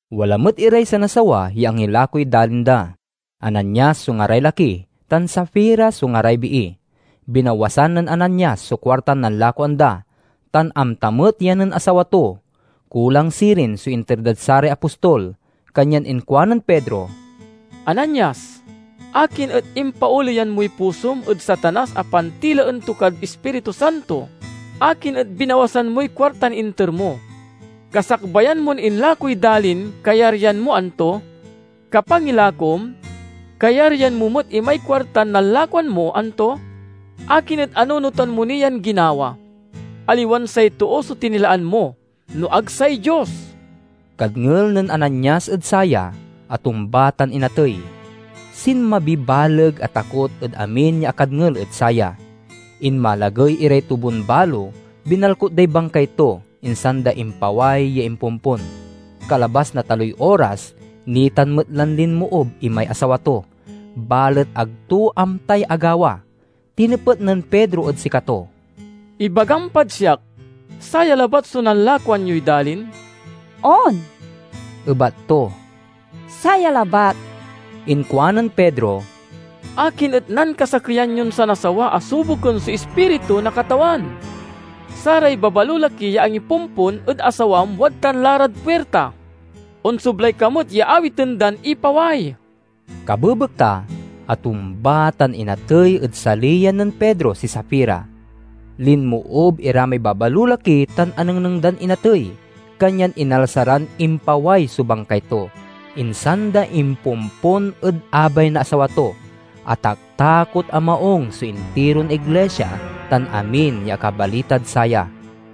Wala met iray sanasawa ya angilakoy dalin da. Ananias so ngaray laki tan Safira so ngaray bii. Binawasan nen Ananias so kuartan nanlakoan da, tan amta met ya nen asawa to. Kulang sirin so inter dad saray apostol. Kanyan inkuanen Pedro, "Ananias, akin et impaoleyan moy pusom ed Satanas a pantilaen to kad Ispiritu Santo? Akin et binawasan moy kuartan inter mo? Kasakbayan mon inlakoy dalin kayaryan mo, anto? Kapangilakom, kayaryan mo met imay kuartan nanlakoan mo, anto? Akin et anunotan mo ni yan ginawa? Aliwan say too so tinilaan mo, no ag say Dios!" Kadngel nen Ananias ed saya, atumba tan inatey. Sinmabiy baleg a takot ed amin ya akadngel ed saya. Inmalagey iray tubon-balo binalkut day bangkay to, insan da impaway ya impompon. Kalabas na taloy oras, nitan met lan linmoob imay asawa to, balet ag to amtay agawa. Tinepet nen Pedro ed sikato, "Ibagam pad siak, saya labat so nanlakoan yoy dalin?" "On," ebat to, "saya labat." Inkuanen Pedro, "Akin et nankasakeyan yon sanasawa a suboken so Ispiritu na Katawan? Saray babalolaki ya angipompon ed asawam wadtan la rad puirta. Onsoblay ka met ya awiten dan ipaway!" Kabebekta, atumba tan inatey ed saliyan nen Pedro si Safira. Linmoob ira may babalolaki tan anengneng dan inatey, kanyan inalsa ran impaway so bangkay to, insan da impompon ed abay na asawa to. Ataktakot a maung so intiron iglisia tan amin ya akabalitad saya.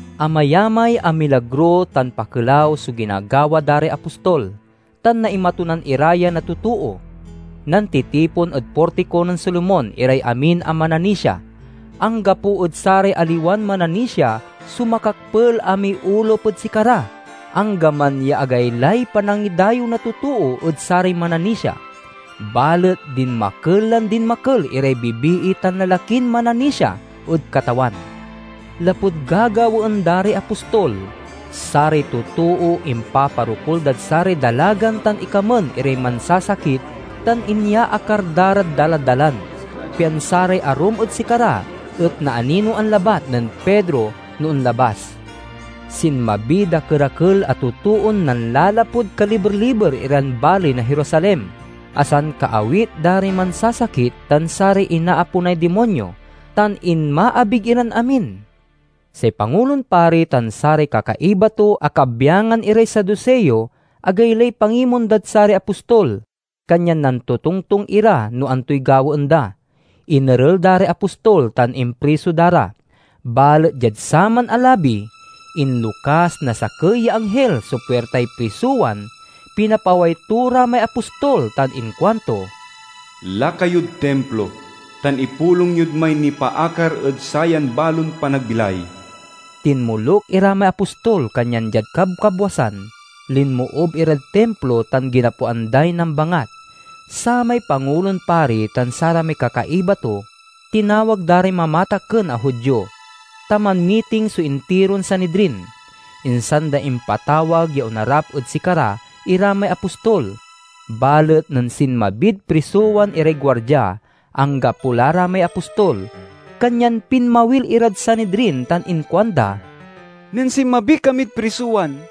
Amayamay a milagro tan pakelaw so ginagawa da ray apostol, tan naimatunan ira ya na totoo. Nantitipon ed Portiko nen Solomon iray amin a mananisia. Anggapo ed saray aliwan mananisia so makakpel a miolup ed sikara, anggaman ya agaylay panangidayew na totoo ed saray mananisia. Balet dinmakel lan dinmakel iray bibii tan lalakin mananisia ed Katawan. Lapud gagawaen da ray apostol, saray totoo impaparokul dad saray dalagan tan ikamen iray mansasakit tan inyaakar da rad daladalan, pian saray arum ed sikara et naaninoan labat nen Pedro no onlabas. Sinmabiy dakerakel a totoon nanlalapud kaliber-liber iran baley na Jerusalem a sankaawit da ray mansasakit tan saray inaaponay dimonyo; tan inmaabig iran amin. Say Pangulon Pari tan saray kakaiba to a kabyangan iray Saduseo agaylay pangimon dad saray apostol, kanyan nantotongtong ira no antoy gawaen da. Inerel da ray apostol tan impriso da ra. Balet diad saman a labi, inlokas na sakey ya anghil so puirtay prisowan, pinapaway to ra may apostol tan inkuanto, "Laka yod Timplo tan ipulong yod may nipaakar ed sayan balon panagbilay." Tinmoluk ira may apostol kanyan diad kabkabwasan, linmoob irad Timplo tan ginapoan day nambangat. Samay Pangulon Pari tan saramay kakaiba to tinawag da ray mamatakken a Judio, ta manmiting so intiron Sanidrin. Insan da impatawag ya onarap ed sikara ira may apostol. Balet nen sinmabid prisowan iray guardia, anggapo la ra may apostol. Kanyan pinmawil irad Sanidrin tan inkuanda, "Nen sinmabi kamid prisowan,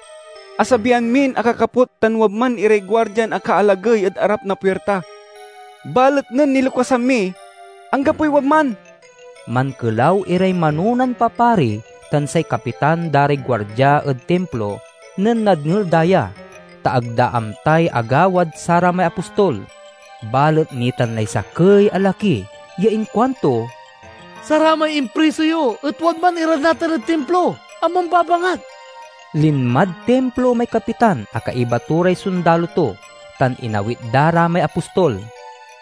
asabian min akakaput tan wadman iray guardian akaalagey ed arap na puirta. Balet nen nilokasan mi, anggapoy wadman!" Mankelaw iray manonan papari tan say kapitan da ray guardia ed Timplo nen nadngel da ya, ta ag da amtay agawad saramay apostol. Balet nitan lay sakey a laki ya inkuanto, "Saramay impriso yo et wadman ira natan ed Timplo a mambabangat!" Linmad Timplo may kapitan a kaiba to ray sondalo to, tan inawit da ra may apostol.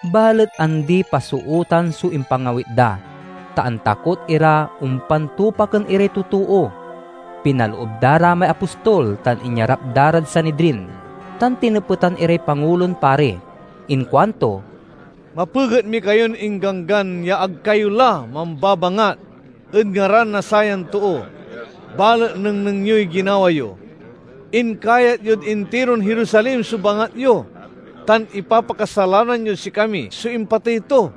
Balet andi-pasootan so impangawit da, ta antakot ira ompan tupaken iray totoo. Pinaloob da ra may apostol tan inyarap da rad Sanidrin, tan tinepetan iray Pangulon Pari. Inkuanto, "Mapeget mi kayon ingganggan ya ag kayo la mambabangat ed ngaran na sayan too, balet nengneng yoy ginawa yo! Inkayat yod intiron Jerusalem so bangat yo, tan ipapakasalanan yod sikami so impatey to."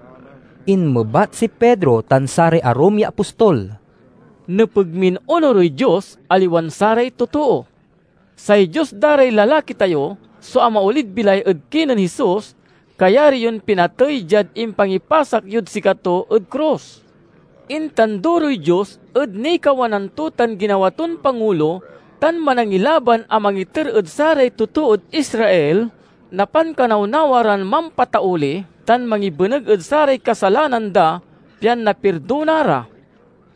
Inmebat si Pedro tan saray arum ya apostol, "Nepeg min onurey Dios, aliwan saray totoo. Say Dios da ray lalaki tayo so amaolid bilay ed kinen Jesus, kayari yon pinatey diad impangipasak yod sikato ed krus. Intanduroy Dios ed nikawanan to tan ginawa ton Pangulo tan Manangilaban a mangiter ed saray totood Israel na pankanawnawa ran mampatauli tan mangibeneg ed saray kasalanan da, pian napirdona ra.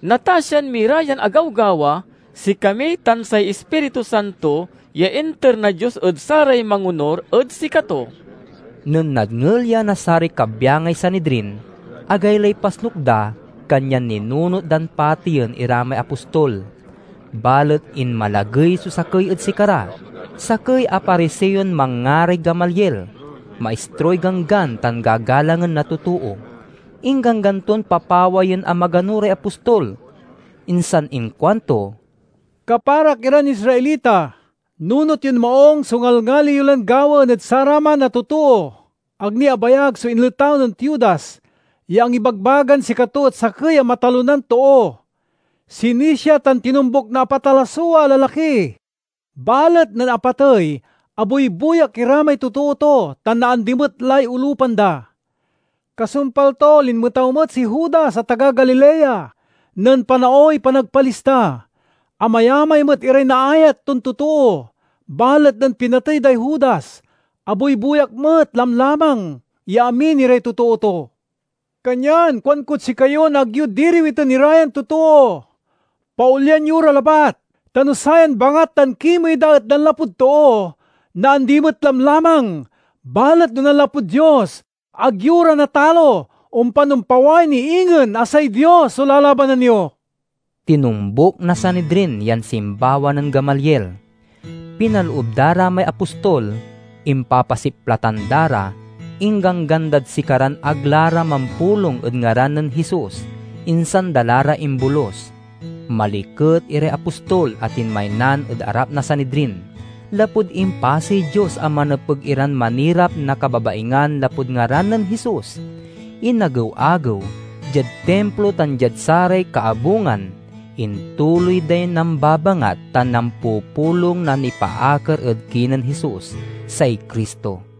Natasian mi ra yan agawgawa—sikami tan say Ispiritu Santo ya inter na Dios ed saray mangonur ed sikato." Nen nadngel ya na saray kabyangay Sanidrin, agaylay pasnuk da, kanyan ninunot dan pateyen ira may apostol. Balet inmalagey so sakey ed sikara, sakey a Pariseon manngaray Gamaliel, maistroy Ganggan tan gagalangen na totoo. Ingganggan ton papawayen a magano ray apostol, insan inkuanto, "Kaparak iran Israelita, nunot yon maung so ngalngali yo lan gawaen ed saraman a totoo Ag ni abayag so inletaw nen Teudas, ya angibagbagan sikato et sakey a matalonan too. Sinisia tan tinombuk na apat a lasua a lalaki. Balet nen apatey, abuybuyak ira may totoo to tan naandi met lay olupan da. Kasumpal to, linmetaw met si Judas a taga Galilea, nen panaoy panagpalista. Amayamay met iray naayat ton totoo. Balet nen pinatey day Judas, abuybuyak met lamlamang ya amin iray totoo to. Kanyan kuankod sikayon ag yo diriwiten ira yan totoo. Paolyan yo ra labat, ta no sayan bangat tan kimey da et nanlapud too, naandi met lamlamang. Balet no nanlapud Dios, ag yo ra natalo. Ompan ompaway ni ingen a say Dios so lalabanan yo!" Tinombuk na Sanidrin yan simbawa nen Gamaliel. Pinaloob da ra may apostol, impapasiplatan da ra, ingganggan dad sikaran ag la ra mampulong ed ngaran nen Jesus, insan da la ra imbolus. Maliket iray apostol a tinmaynan ed arap na Sanidrin, lapud impasey Dios a manepeg iran manirap na kababaingan lapud ngaran nen Jesus. Inagew-agew, diad Timplo tan diad saray kaabungan, intuloy day nambabangat tan nampupulong na nipaakar ed kinen Jesus, say Cristo.